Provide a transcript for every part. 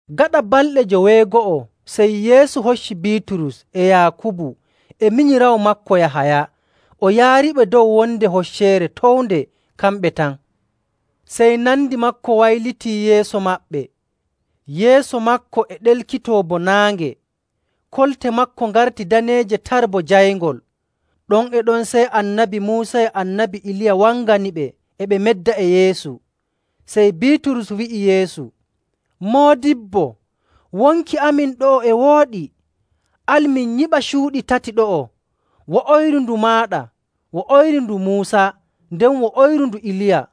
Gaɗa balɗe joweego'o, sey Yeesu hocci Biiturus e Yaakubu e minyiraawo maako Yahaya, o yaariɓe dow wonde hocceere townde kamɓe tan. Sey nandi maako wayliti yeeso maɓɓe. Yeeso maako e ɗelkitoo bo naange. Kolte maako ngarti daneeje tar bo jayngol. Ɗon e ɗon sey Annabi Muusa e Annabi Iliya wanganiɓe e ɓe medda e Yeesu. Sey Biiturus wi'i Yeesu, “Moodibbo, wonki amin ɗo'o e wooɗi. Al min nyiɓa cuuɗi tati ɗo'o, wo'oyru ndu maaɗa, wo'oyru ndu Muusa, nden wo'oyru ndu Iliya.”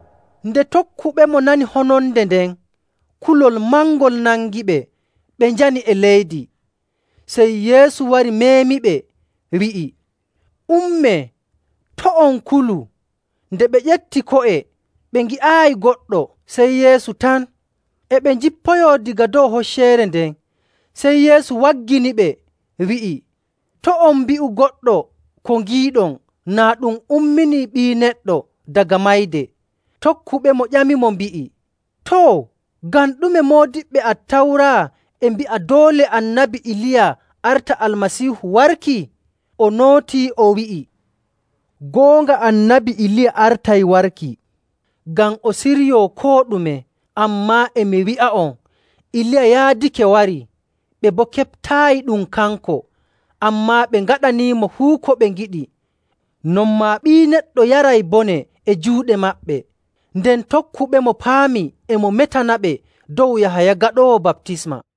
Nde tokkuɓemo nani hononde nden, kulol mangol nangiɓe ɓe njani e leydi. Sey Yeesu wari meemiɓe, wi'i, “Ummee, to' on kulu.” Nde ɓe ƴefti ko'e, ɓe ngi'aayi goɗɗo sey Yeesu tan. E ɓe njippoyoo daga dow hocceere nden, sey Yeesu wagginiɓe, wi'i, “To' on mbi'u goɗɗo ko ngiiɗon naa ɗum ummini Ɓii Neɗɗo daga mayde.” Tokkuɓemo ƴamimo, mbi'i, “Too, ngam ɗume moodiɓɓe Attawra e mbi'a doole Annabi Iliya arta Almasiihu warki?”. O nootii, o wi'i, “Goonga Annabi Iliya artay warki, ngam o siryoo koo ɗume. Ammaa e mi wi'a'on, Iliya yaadake warii, ɓe boo keɓtaayi ɗum kanko, ammaa ɓe ngaɗanimo fuu ko ɓe ngiɗi. Non maa Ɓii Neɗɗo yaray bone e juuɗe maɓɓe.”. Nden tokkuɓemo paami e mo metanaɓe dow Yahaya Gaɗoowo Baptisma.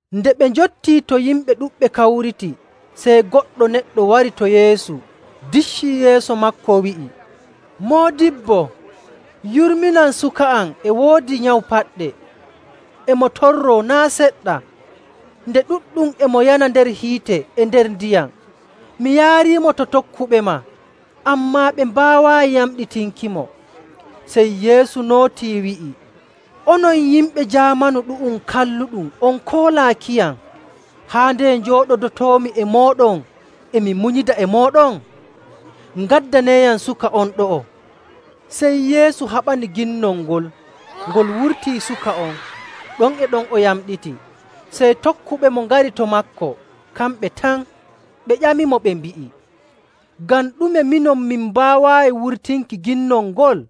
Nde ɓe njottii to yimɓe ɗuɗɓe kawriti, sey goɗɗo neɗɗo wari to Yeesu diccii yeeso maako wi'i, “Moodibbo, yurminan suka am e woodi nyawu paɗɗe, e mo torroo naa' seɗɗa. Nde ɗuɗɗum e mo yana nder hiite e nder ndiyam. Mi yaariimo to tokkuɓema, ammaa ɓe mbaawaayi yamɗitinkimo.” Sey Yeesu nootii wi'i, “Onon yimɓe jaamanu ɗu'um kalluɗum on koolaakiyam, haa ndeye njooɗodotoomi e mooɗon e mi munyida e mooɗon? Ngaddaneeyam suka on ɗo'o.” Sey Yeesu haɓani ginnol ngol, ngol wurtii suka on, ɗon e ɗon o yamɗiti. Sey tokkuɓemo ngari to maako kamɓe tan, ɓe ƴamimo ɓe mbi'i, “Ngam ɗume minon min mbaawaayi wurtinki ginnol ngol?”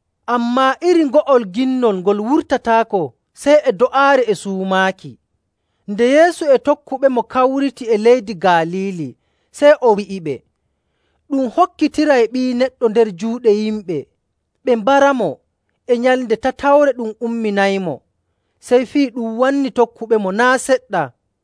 [Ammaa iri ngo'ol ginnol ngol wurtataako sey e do'aare e suumaaki.]” Nde Yeesu e tokkuɓemo kawriti e leydi Galiili, sey o wi'iɓe, “Ɗum hokkitiray Ɓii Neɗɗo nder juuɗe yimɓe, ɓe mbaramo, e nyalnde tatawre ɗum umminaymo.” Sey fii ɗum wanni tokkuɓemo naa' seɗɗa.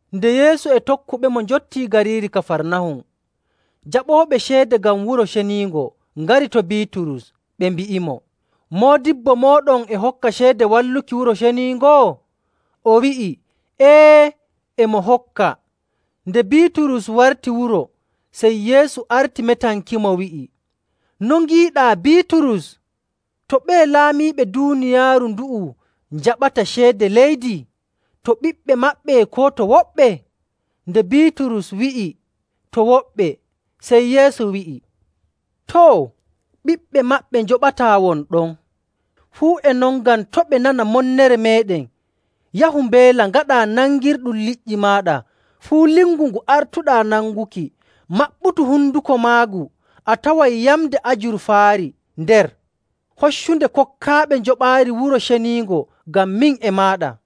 Nde Yeesu e tokkuɓemo njottii gariiri Kafarnahum, jaɓooɓe ceede ngam Wuro Ceniingo ngari to Biiturus, ɓe mbi'imo, “Moodibbo mooɗon e hokka ceede walluki Wuro Ceniingo?”. O wi'i, “Ee, e mo hokka.” Nde Biiturus warti wuro, sey Yeesu arti metankimo, wi'i, “No ngiiɗaa, Biiturus? To ɓeye laamiiɓe duuniyaaru ndu'u njaɓata ceede leydi, to ɓiɓɓe maɓɓe koo to woɓɓe?” Nde Biiturus wi'i, “To woɓɓe,” sey Yeesu wi'i, “Too, ɓiɓɓe maɓɓe njoɓataa won ɗon. Fuu e non, ngam to' ɓe nana monnere meeɗen, yahu mbeela ngaɗaa nangirɗum liƴƴi maaɗa. Fuu lingu ngu artuɗaa nanguki, maɓɓutu honduko maagu a taway yamnde ajurfaari nder. Hoccunde, kokkaaɓe njoɓaari Wuro Ceniingo ngam min e maaɗa.”